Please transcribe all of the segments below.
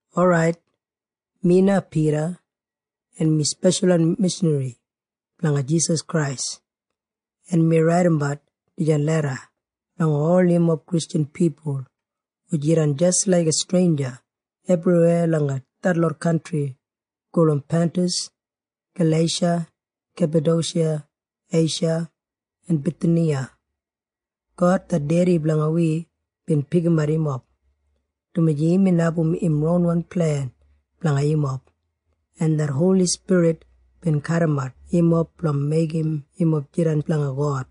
Orait, mi na Pida, en mi speshalwan mishanri blanga Jisas Krais. En mi raidimbat dijan leda langa ol yumob Kristjan pipul hu jidan jis laiga streinja ebriweya langa detlot kantri gulum Pantas, Galeisha, Kepadoshiya, Eisha en Bithiniya. God det Dedi blanga wi bin pikimat yumob, dumaji imbin abum im ronwan plen blanga yumob, en det Holi Spirit bin kadimat yumob blanga meigim yumob jidan blanga God,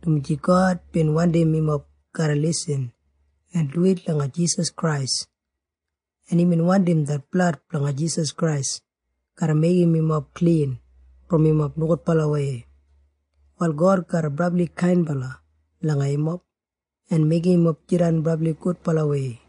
dumaji God bin wandim yumob garra lisin en duwit langa Jisas Krais, en imbin wandim det blad blanga Jisas Krais garra meigim yumob klin brom yumob nogudbalawei. Wal God garra brabli kainbala langa yumob en meigim yumob jidan brabli gudbalawei.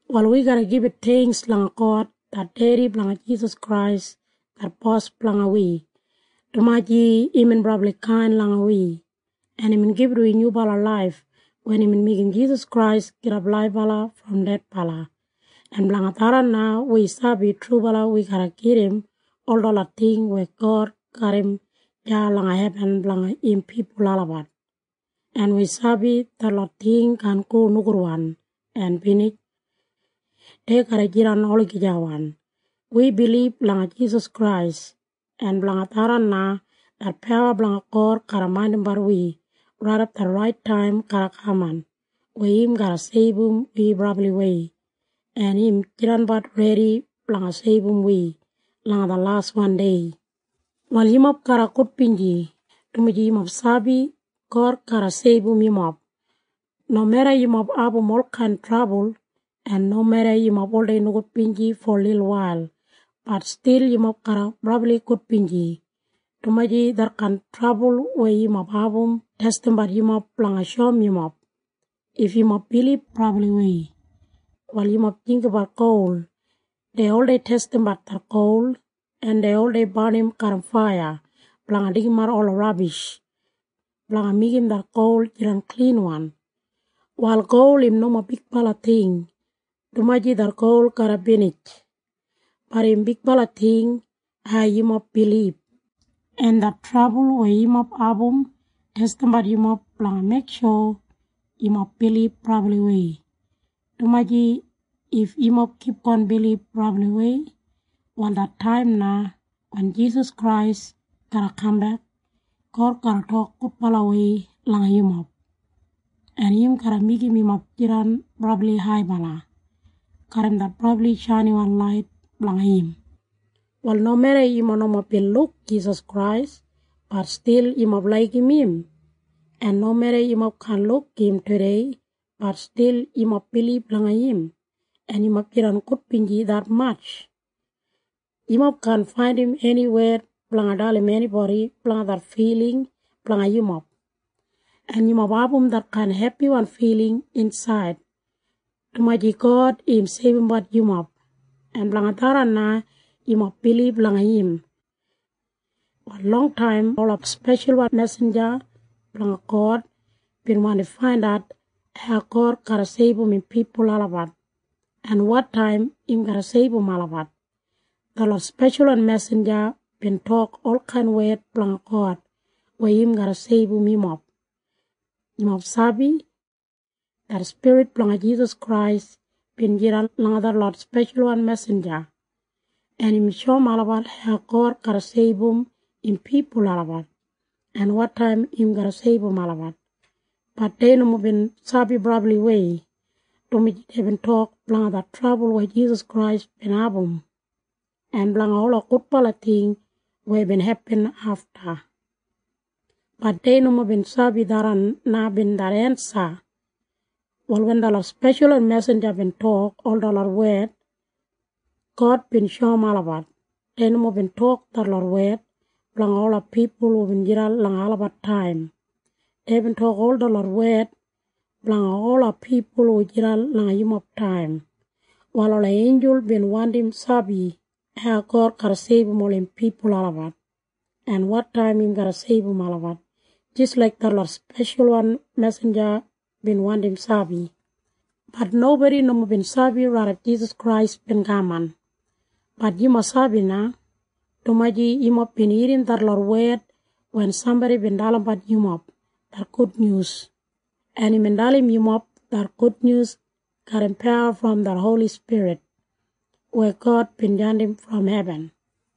Wal wi garra gibit theingks langa God det dedi blanga Jisas Krais det Bos blanga wi, dumaji imbin brabli kain langa wi, en imbin gibit wi nyubala laif wen imbin meigim Jisas Krais gidap laibala brom dedbala, en blanga tharran na wi sabi trubala wi garra gedim ol detlot ting weya God garram deya langa hebin blanga im pipul olabat, en wi sabi detlot ting kaan go nogudwan en binij. Dei garra jidan olagijawan. Praise Wi bilib langa Jisas Krais en blanga tharran na, det pawa blanga God garra maindimbat wi raidap det rait taim garra kaman weya im garra seibum wi brabliwei, en im jidanbat redi blanga seibum wi langa det laswan dei. Wal yumob garra gudbinji, dumaji yumob sabi God garra seibum yumob. Nomeda yumob abum olkain trabul, en nomeda yumob oldei nogudbinji fo lilwail, bat stil yumob garra brabli gudbinji, dumaji detkain trabul weya yumob abum, testimbat yumob blanga shoum yumob if yumob bilib brabliwei. Wal yumob jinggabat gol. Dei oldei testimbat det gol, en dei oldei barnim garram faiya blanga deigimat ola rabish blanga meigim det gol jidan klinwan. Wal gol im nomo bigbala ting, dumaji det gol garra binij. Bat im bigbala ting hau yumob bilib. En det trabul weya yumob abum testimbat yumob blanga meiksho yumob bilib brabliwei, dumaji if yumob kipgon bilib brabliwei, wal det taim na wen Jisas Krais garra kambek, God garra tok gudbalawei langa yumob, en im garra meigim yumob jidan brabli haibala garram det brabli shainiwan lait blanga im. Wal nomeda yumob nomo bin luk Jisas Krais, bat stil yumob laigim im, en nomeda yumob kaan luk im tudei, bat stil yumob bilib langa im, en yumob jidan gudbinji detmatj. Yumob kaan faindim eni wed blanga dalim enibodi blanga det filing blanga yumob. En yumob abum detkain hepiwan filing insaid, dumaji God im seibumbat yumob, en blanga tharran na yumob bilib langa im. Wal longtaim ola speshalwan mesinja blanga God bin wandi faindat hau God garra seibum im pipul olabat en wotaim im garra seibum olabat. Detlot speshalwan mesinja bin tok olkain wed blanga God weya im garra seibum yumob. Yumob sabi? Det Spirit blanga Jisas Krais bin jidan langa detlot speshalwan mesinja, en imbin shoum olabat hau God garra seibum im pipul olabat en wotaim im garra seibum olabat. Bat dei nomo bin sabi brabliwei, dumaji deibin tok blanga det trabul weya Jisas Krais bin abum en blanga ola gudbala ting weya bin hepin afta. Bat dei nomo bin sabi tharran na bin det ensa. Wal wen detlot speshalwan mesinja bin tok ol detlot wed, God bin shoum olabat dei nomo bin tok detlot wed blanga ola pipul hubin jidan langa olabat taim. Deibin tok ol detlot wed blanga ola pipul hu jidan langa yumob taim. Wal ola einjul bin wandim sabi hau God garra seibum ol im pipul olabat en wotaim im garra seibum olabat jis laik detlot speshalwan mesinja bin wandim sabi. Bat nobodi nomo bin sabi raidap Jisas Krais bin kaman. Bat yumob sabi na, dumaji yumob bin irrim detlot wed wen sambodi bin dalimbat yumob det gudnyus, en imbin dalim yumob det gudnyus garram pawa brom det Holi Spirit weya God bin jandim brom hebin.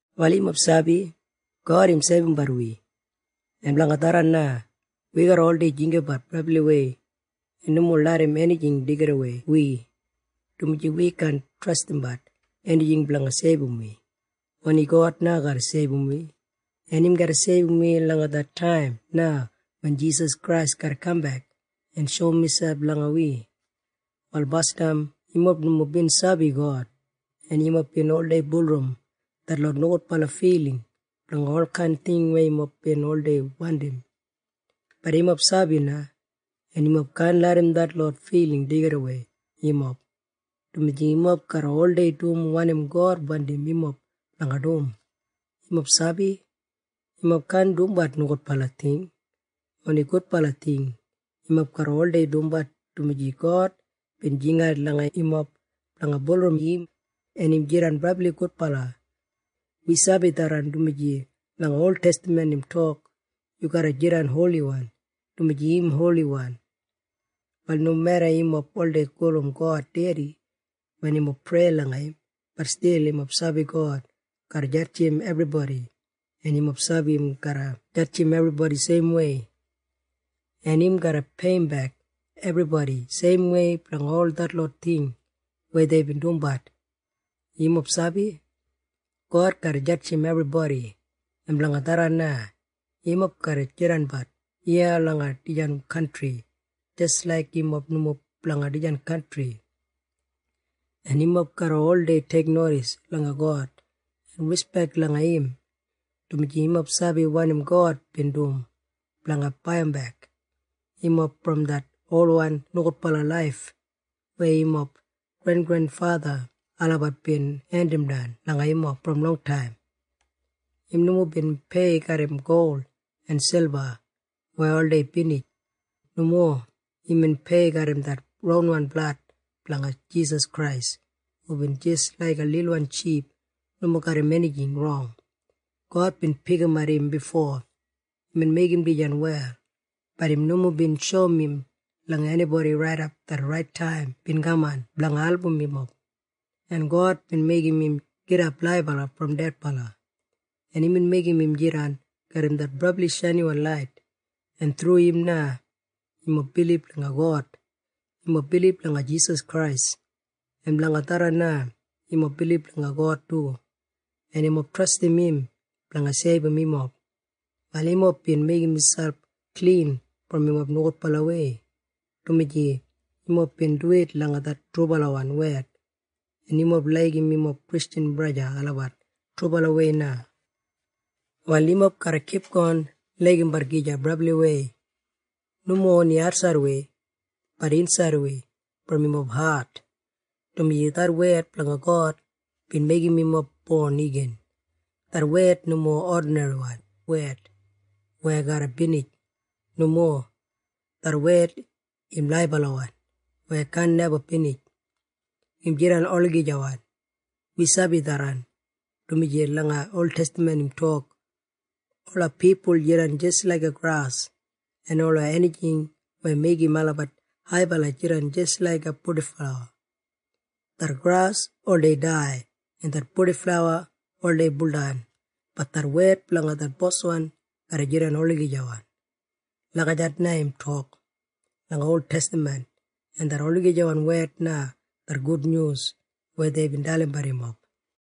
Wal yumob sabi God im seibumbat wi. En blanga tharran na wi garra oldei jinggabat brabliwei en nomo larram enijing deigidawei wi, dumaji wi kaan trastimbat enijing blanga seibum wi. Oni God na garra seibum wi. En im garra seibum wi langa det taim na wen Jisas Krais garra kambek en shoum miselp langa wi. Wal basdam yumob nomo bin sabi God, en yumob bin oldei bulurrum detlot nogudbala filing blanga olkain ting weya yumob bin oldei wandim. Bat yumob sabi na, en yumob kaan larram detlot filing deigidawei yumob, dumaji yumob garra oldei dum wanim God wandim yumob blanga dum. Yumob sabi? Yumob kaan dumbat nogudbala ting. Oni gudbala ting yumob garra oldei dumbat, dumaji God bin jingat langa yumob blanga bulurrum im, en im jidan brabli gudbala. Wi sabi tharran, dumaji langa oltestaman God im tok, “Yumob garra jidan holiwan, dumaji mi holiwan.” Wal nomeda yumob oldei gulum God dedi wen yumob prei langa im, bat stil yumob sabi God garra jadjim ebribodi, en yumob sabi im garra jadjim ebribodi seimwei, en im garra peiyimbek ebribodi seimwei blanga ol detlot ting weya deibin dumbat. Yumob sabi? God garra jadjim ebribodi. En blanga tharran na yumob garra jidanbat iya langa dijan kantri jis laik yumob nomo blanga dijan kantri, en yumob garra oldei teiknodis langa God en rispek langa im, dumaji yumob sabi wanim God bin dum blanga baiyimbek yumob brom det olwan nogudbala laif weya yumob grengrenfatha olabat bin hendimdan langa yumob brom longtaim. Im nomo bin pei garram gol en silba weya oldei binij. Nomo. Imbin pei garram det ronwan blad blanga Jisas Krais hubin jis laiga lilwan ship nomo garram enijing rong. God bin pikimat im bifo imbin meigim dijan wel. Bat im nomo bin shoum im langa enibodi raidap det rait taim bin kaman blanga album yumob, en God bin meigim im gidap laibala brom dedbala, en imbin meigim im jidan garram det brabli shainiwan lait, en thru im na yumob bilib langa God. Yumob bilib langa Jisas Krais, en blanga tharran na yumob bilib langa God du, en yumob trastim im blanga seibum yumob. Wal yumob bin meigim miselp klin brom yumob nogudbalawei, dumaji yumob bin duwit langa det trubalawan wed, en yumob laigim yumob Kristjan braja en sista olabat trubalawei na. Wal yumob garra kipgon laigimbat gija brabliwei. Nomo oni atsaidwei, bat insaidwei brom yumob hat, dumaji det wed blanga God bin meigim yumob bon igin. Det wed nomo odinriwan wed weya garra binij. Nomo. Det wed im laibalawan weya kaan neba binij. Im jidan olagijawan. Wi sabi tharran, dumaji langa oltestaman im tok, “Ola pipul jidan jis laiga gras, en ola enijing weya meigim olabat haibala jidan jis laiga purdiflawa. Det gras oldei dai, en det purdiflawa oldei buldan. Bat det wed blanga det Boswan garra jidan olagijawan.” Lagijat na im tok langa oltestaman. En det olagijawan wed na det gudnyus weya deibin dalimbat yumob.